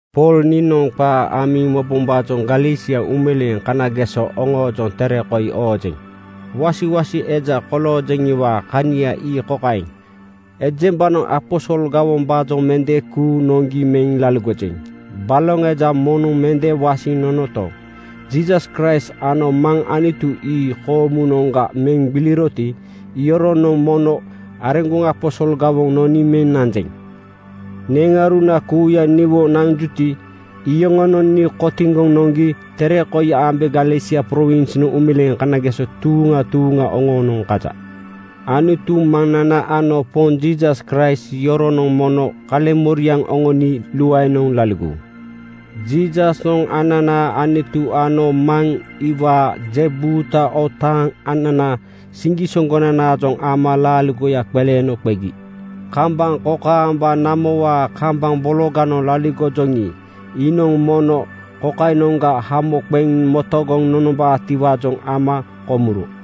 Pool niinoŋ qaa amiŋ mobombaajoŋ Galesia uumeleeŋ kanageso oŋoojoŋ tere koi oojeŋ. Wasiwasi eja koloojeŋiwaa kania ii kokaeŋ: Ejembanoŋ aposol gawombaajoŋ mende kuuŋ noŋgi meŋ laligojeŋ. Baloŋ eja moŋnoŋ mende wasiŋ nonoto, Jiisas Kraist ano Maŋ Anutu ii koomunoŋga meŋ gbiliroti, iyoronoŋ mono areŋgoŋ aposol gawoŋ noni meŋ nanjeŋ. Neŋauruna kuuya niwo nanjuti, iyoŋonoŋ nii kotiŋgoŋ noŋgi tere koi ambe Galesia prowinsnoŋ uumeleeŋ kanageso tuuŋa tuuŋa oŋoonoŋ kaja. Anutu Maŋnana ano Poŋ Jiisas Kraist yoronoŋ mono kaleŋmoriaŋ oŋoni luaenoŋ laligowu. Jiisasnoŋ ananaa Anutu ano Maŋ iwaa je buuta otaaŋ ananaa siŋgisoŋgonanaajoŋ ama laaligoya qeleeno qegi. Kambaŋ kokaamba namowaa kambaŋ bologanoŋ laligoŋkejoŋi, iinoŋ mono kokainoŋga hamo qeŋ metogoŋ nonombaatiwaajoŋ ama komuro.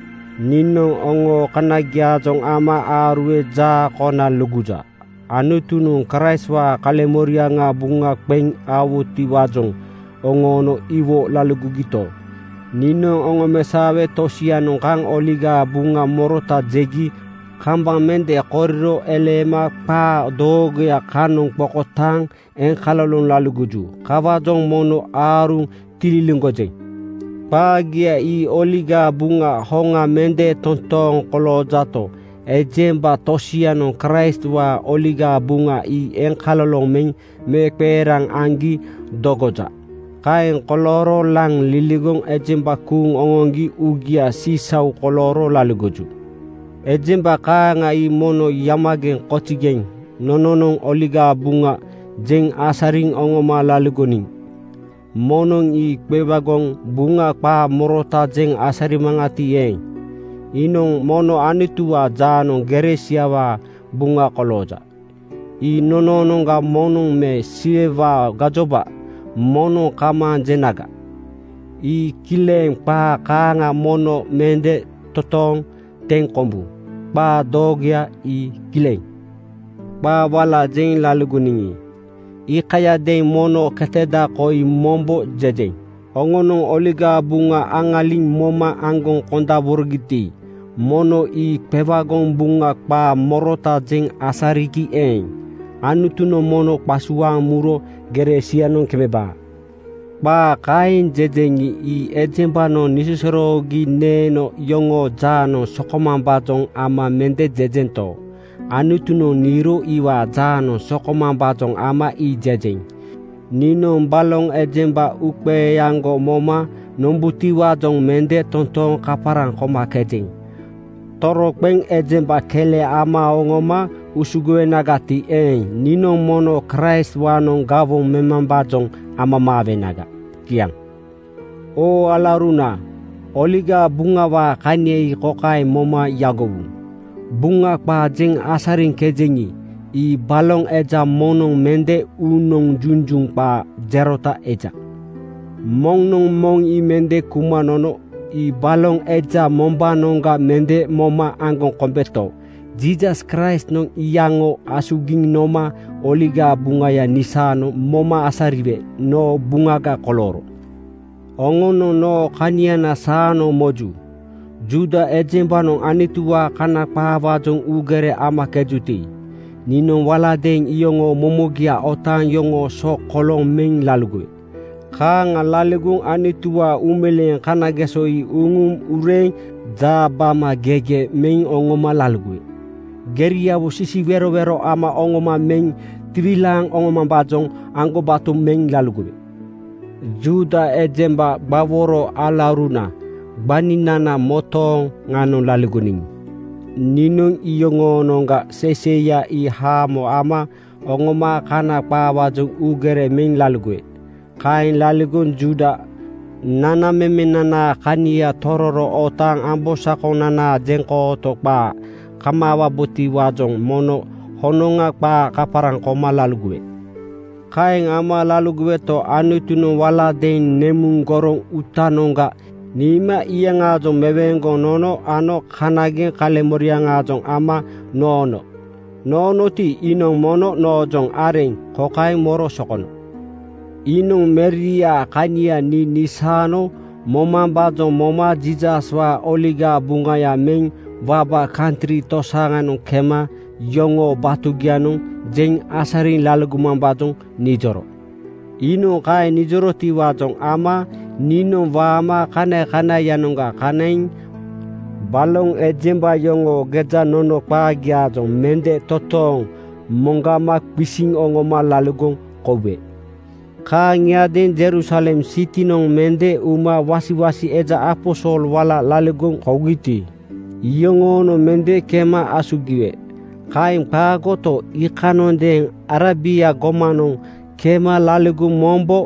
Niinoŋ oŋoo kanagiaajoŋ ama aaruwe jaa kona luguja. Anutunoŋ Kraistwaa kaleŋmoriaŋa buŋa qeŋ aowutiwaajoŋ oŋoono iwo laligogito, niinoŋ oŋomesaowe tosianoŋ kaŋ Oligaa Buŋa morota jegi kambaŋ mende koriro eleema qaa doogoya kanoŋ qokotaaŋ eŋkaloloŋ laligoju. Kawaajoŋ mono aaruŋ tililiŋgojeŋ. Qaagia ii Oligaa Buŋa hoŋa mende totooŋ koloojato, ejemba tosianoŋ Kraistwaa Oligaa Buŋa ii eŋkaloloŋ meŋ meeqeeraŋ aŋgi dogoja. Kaeŋ kolooro laŋ liligoŋ ejemba kuuŋ oŋoŋgi uugia sisau kolooro laligoju. Ejemba kaaŋa ii mono yamageŋ (kozigeŋ)! Nononoŋ Oligaa Buŋa jeŋ asariŋ oŋoma laligoniŋi, moŋnoŋ ii qewagoŋ buŋa qaa morota jeŋ asarinagati eeŋ, iinoŋ mono Anutuwaa jaanoŋ gere siawaa buŋa kolooja. Ii nonoonoŋga moŋnoŋ me Siwewaa gajoba moŋnoŋ kamaaŋ jenaga, ii kileŋ qaa kaaŋa mono mende totooŋ teŋ kombu. Qaa doogoya ii kileŋ. Qaa wala jeŋ laligoniŋi, iikayadeeŋ mono keteda koi mombo jejeŋ: Oŋonoŋ Oligaa Buŋa aŋaliŋ moma aŋgoŋ kondaborogiti, moŋnoŋ ii qewagoŋ buŋa qaa morota jeŋ asarinagi eeŋ, Anutunoŋ mono ii qasuaaŋ muro gere sianoŋ kemeba. Qaa kaeŋ jejeŋi, ii ejembanoŋ nisosoroogi neeno yoŋoo jaanoŋ sokomambaajoŋ ama mende jejento, Anutunoŋ niiro iwaa jaanoŋ sokomambaajoŋ ama ii jejeŋ. Niinoŋ baloŋ ejemba uuqeeaŋgo moma nombutiwaajoŋ mende totooŋ kaparaŋ komakejeŋ. Toroqeŋ ejemba kele ama oŋoma usugowenagati eeŋ, niinoŋ mono Kraistwaanoŋ gawoŋ memambaajoŋ amamaawenaga. Kiaŋ. Oo alauruna, Oligaa Buŋawaa kania ii kokaeŋ moma yagowu: Buŋa qaa jeŋ asariŋkejeŋi, ii baloŋ eja moŋnoŋ mende uunoŋ junjuŋ qaa jerota eja. Moŋnoŋ moŋ ii mende kuma nono. Ii baloŋ eja mombaanoŋga mende moma aŋgoŋ kombeto, Jiisas Kraistnoŋ iyaŋo asugiŋ noma Oligaa Buŋaya nisaano moma asariwe noo buŋaga kolooro. Oŋonoŋ noo kaniana saanoŋ moju. Juuda ejembanoŋ Anutuwaa Kana qaawaajoŋ uugere amakejuti, niinoŋ waladeeŋ iyoŋoo momogia otaaŋ yoŋoo so kolooŋ meŋ laligowe. Kaaŋa laligoŋ Anutuwaanoŋ uumeleeŋ kanageso ii uŋuŋ ureeŋ jaabamagege meŋ oŋoma laligowe. Geriawo sisiwerowero ama oŋoma meŋ tiwilaaŋ oŋomambaajoŋ aŋgobato meŋ laligowe. Juuda ejemba gbaworo alauruna gbaninana motooŋanoŋ laligoniŋi, niinoŋ iyoŋoonoŋga seiseiya ii haamo ama oŋoma Kana qaawaajoŋ uugere meŋ laligowe. Kaeŋ laligoŋ Juuda nanamemenanaa kania tororo otaaŋ ambosakonanaa jeŋkooto qaa kamaawabotiwaajoŋ mono honoŋa qaa kaparaŋ koma laligowe. Kaeŋ ama laligoweto, Anutunoŋ walagadeeŋ nemuŋ goroŋ uutanoŋga niima iyaŋaajoŋ meweeŋgoŋ nono ano kanageŋ kaleŋmoriaŋaajoŋ ama noono. Noonoti, iinoŋ mono noojoŋ areŋ kokaeŋ moro sokono: Iinoŋ Meriaa kania nii nisaano momambaajoŋ moma Jiisaswaa Oligaa Buŋaya meŋ waba kantri tosianoŋ kema yoŋoo batugianoŋ jeŋ asariŋ laligomambaajoŋ nijoro. Iinoŋ kaeŋ nijorotiwaajoŋ ama niinoŋ waama kanakanaiyanoŋga kanaiŋ baloŋ ejemba yoŋoo gejanono qaagiaajoŋ mende totooŋ moŋgama qisiŋ oŋoma laligoŋ koube. Kaaŋiadeeŋ Jerusalem sitinoŋ mende uma wasiwasi eja aposol wala laligoŋ kougiti, iyoŋoonoŋ mende kema asugiwe. Kaeŋ qaagoto, iikanondeeŋ Arebia gomanoŋ kema laligoŋ mombo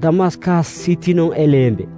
Damaskas sitinoŋ eleembe.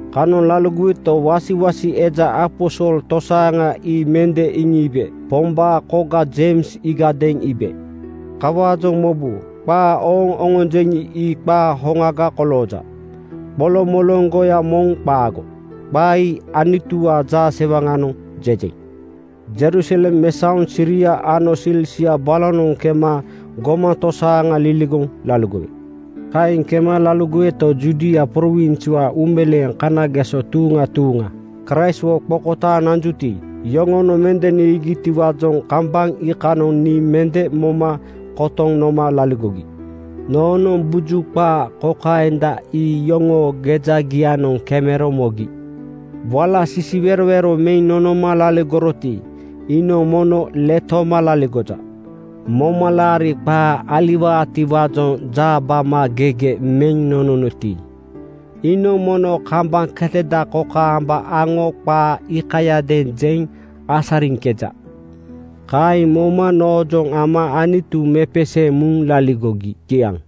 Kanoŋ laligoweto, wasiwasi eja aposol tosaaŋa ii mende iŋiibe. Pombaa koga Jeims iigadeeŋ iibe. Kawaajoŋ mobu, qaa ooŋ oŋonjeŋi, ii qaa hoŋaga kolooja. Qoloŋmoloŋgoya moŋ qaago. Qaa ii Anutuwaa jaasewaŋanoŋ jejeŋ. Jerusalem mesaoŋ Siria ano Silisia balonoŋ kema gomaŋ tosaaŋa liligoŋ laligowe. Kaeŋ kema laligoweto, Judia prowinswaa uumeleeŋ kanageso tuuŋa tuuŋa Kraistwo qokotaaŋ nanjuti, iyoŋonoŋ mende niigitiwaajoŋ kambaŋ iikanoŋ nii mende moma kotoŋ noma laligogi. Noonoŋ buju qaa kokaenda ii yoŋoo gejagianoŋ kemero mogi, “Wala sisiwerowero meŋ nonoma laligoroti, iinoŋ mono letoma laligoja. Momalaari qaa aliwaatiwaajoŋ jaabamagege meŋ nononoti, iinoŋ mono kambaŋ ketada kokaamba aŋo qaa iikayadeeŋ jeŋ asariŋkeja.” Kaeŋ moma noojoŋ ama Anutu mepeseeŋ muŋ laligogi. Kiaŋ.